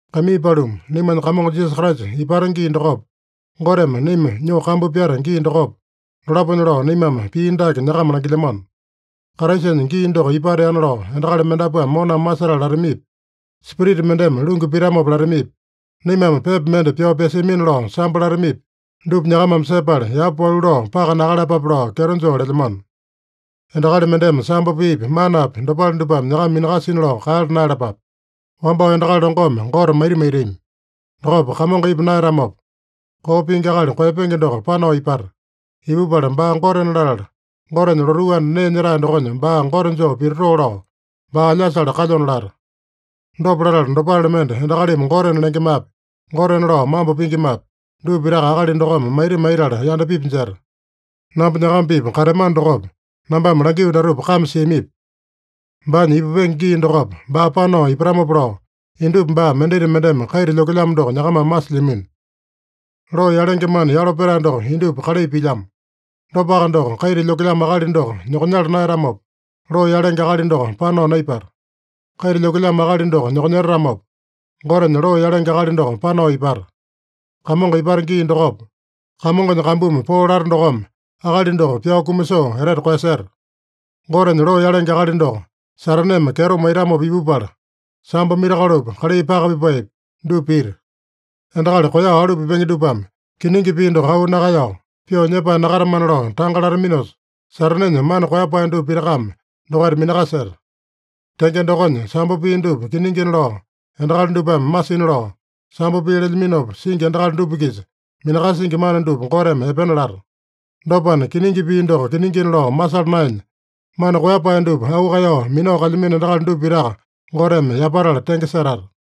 Kaimii paluma, naimanya Kamongo Jisasa Kraisa ipata gii dokopa, Goteme naima nyoo kambu pyata gii dokopa, dolaponya lao naimame pii dake nyakama langilyamano: Kraisanya gii doko ipateana lao endakali mendapuame moname masetala latamipi, spirita mendeme lungu pitamopa latamipi, naimame pepa mende pyao pyasiamina lao sambo latamipi, dupa nyakamame sepala, yapa walu lao paka nakaeyalapape lao kyeto joo lelyamano. Endakali mendeme sambo piipi manapi dopale dupame nyakama minakasina lao kaeyala naeyalapape. Wambao endakali longome Gote maita maitami. Dokopa Kamongo ipa naeyatamopa, koo pingi akali koeyapenge doko panao ipata. Ipupala baa Gotena latala, Gotenya lotuu anda nee nyetae dokonya baa Gote joo pititoo lao, baa alyasale kalyona lata. Dopa latala, dopale mende endakalimi gotena lengemapi, gotena lao mambo pingimapi, dupa pitaka akali dokome maita maitala yandapipi jeta. Namba nyakama-pipa kateamano dokopa, nambame langio datupa kame siamipi? Baanya ipupenge gii dokopa baa panao ipatamopa lao, indupa baa mendita mendeme kaita lyokelyamo doko nyakamame masilyamino. Loo yalenge mana yalo petae doko indupa kalai pilyamo. Dopaka doko, kaita lyokelyamo akali doko nyokonyala naeyatamopa, loo yalenge akali doko panao naipata. Kaita lyokelyamo akali doko nyokonyetatamopa, Gotenya loo yalenge akali doko panao ipata. Kamongo ipata gii dokopa, Kamongonya kambumi poo lata dokome akali doko pyao kumasoo etete koeyaseta. Gotenya loo yalenge akali doko Sataneme kyeto maitamopa ipupala, sambo mirakolopi, kalai paka pipaepi, dupa pita. Endakali koeyao alu pipenge dupame kiningi pii doko auu nakaeyao, pyoo nyepae nakatamana lao tanga lataminosa, Satanenya mana koeyapae dupa pitakame dokaita minakaseta. Tenge dokonya, sambo pii dupa kiningina lao endakali dupame masina lao, sambo pii lelyaminopa singi endakali dupa-kisa minakasingi mana dupa Goteme epena lata. Dopana, kiningi pii doko kiningina lao masala naenya, mana koeyapae dupa auu kaeyao minao kalyamino endakali dupa pitaka Goteme yapatala tenge setata.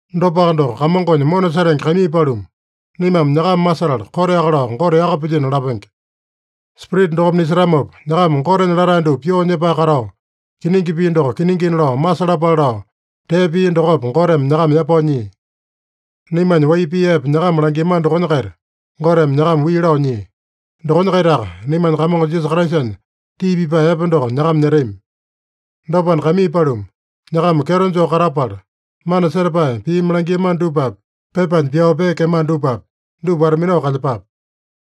Dopaka doko, Kamongonya mona setenge kaimii paluma, naimame nyakama masetala, koteaka lao Gote yaka pilyino lapenge. Spirita dokome nisetamopa, nyakama Gotenya latae dupa pyoo nyepae katao, kiningi pii doko kiningina lao masalapale lao, tee pia dokopa Goteme nyakama yapao nyia. Naimanya wai pii epe nyakama langiamano dokonya-kaita Goteme nyakama wii lao nyia. Dokonya-kaitaka naimanya Kamongo Jisasa Kraisanya tii pipae epe doko nyakama nyetami. Dopana, kaimii paluma, nyakama kyeto joo katapala, mana setapae piimi langiamano dupapi, pepanya pyao peekeamano dupapi, dupa wata-minao kalyepape.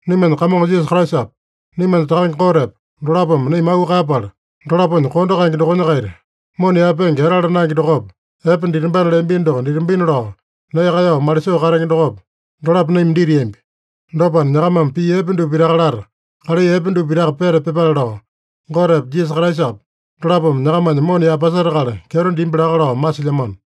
Naimanya Kamongo Jisasa Kraisapa, naimanya Takange Gotepa, dolapome naima auu kaeyapala, dolaponya kondo kaenge dokonya-kaita mona yaepenge etala naenge dokopa, epe ditambana leambino doko ditambina lao nee kaeyao malisoo katenge dokopa, dolapo naima ditiambi. Dopana, nyakamame pii epe dupa pitaka lata, kalai epe dupa pitaka peta pyepale lao, Gotepa, Jisasa Kraisapa dolapome nyakamanya mona yaepasetakala kyeto dimbi laka lao masilyamano.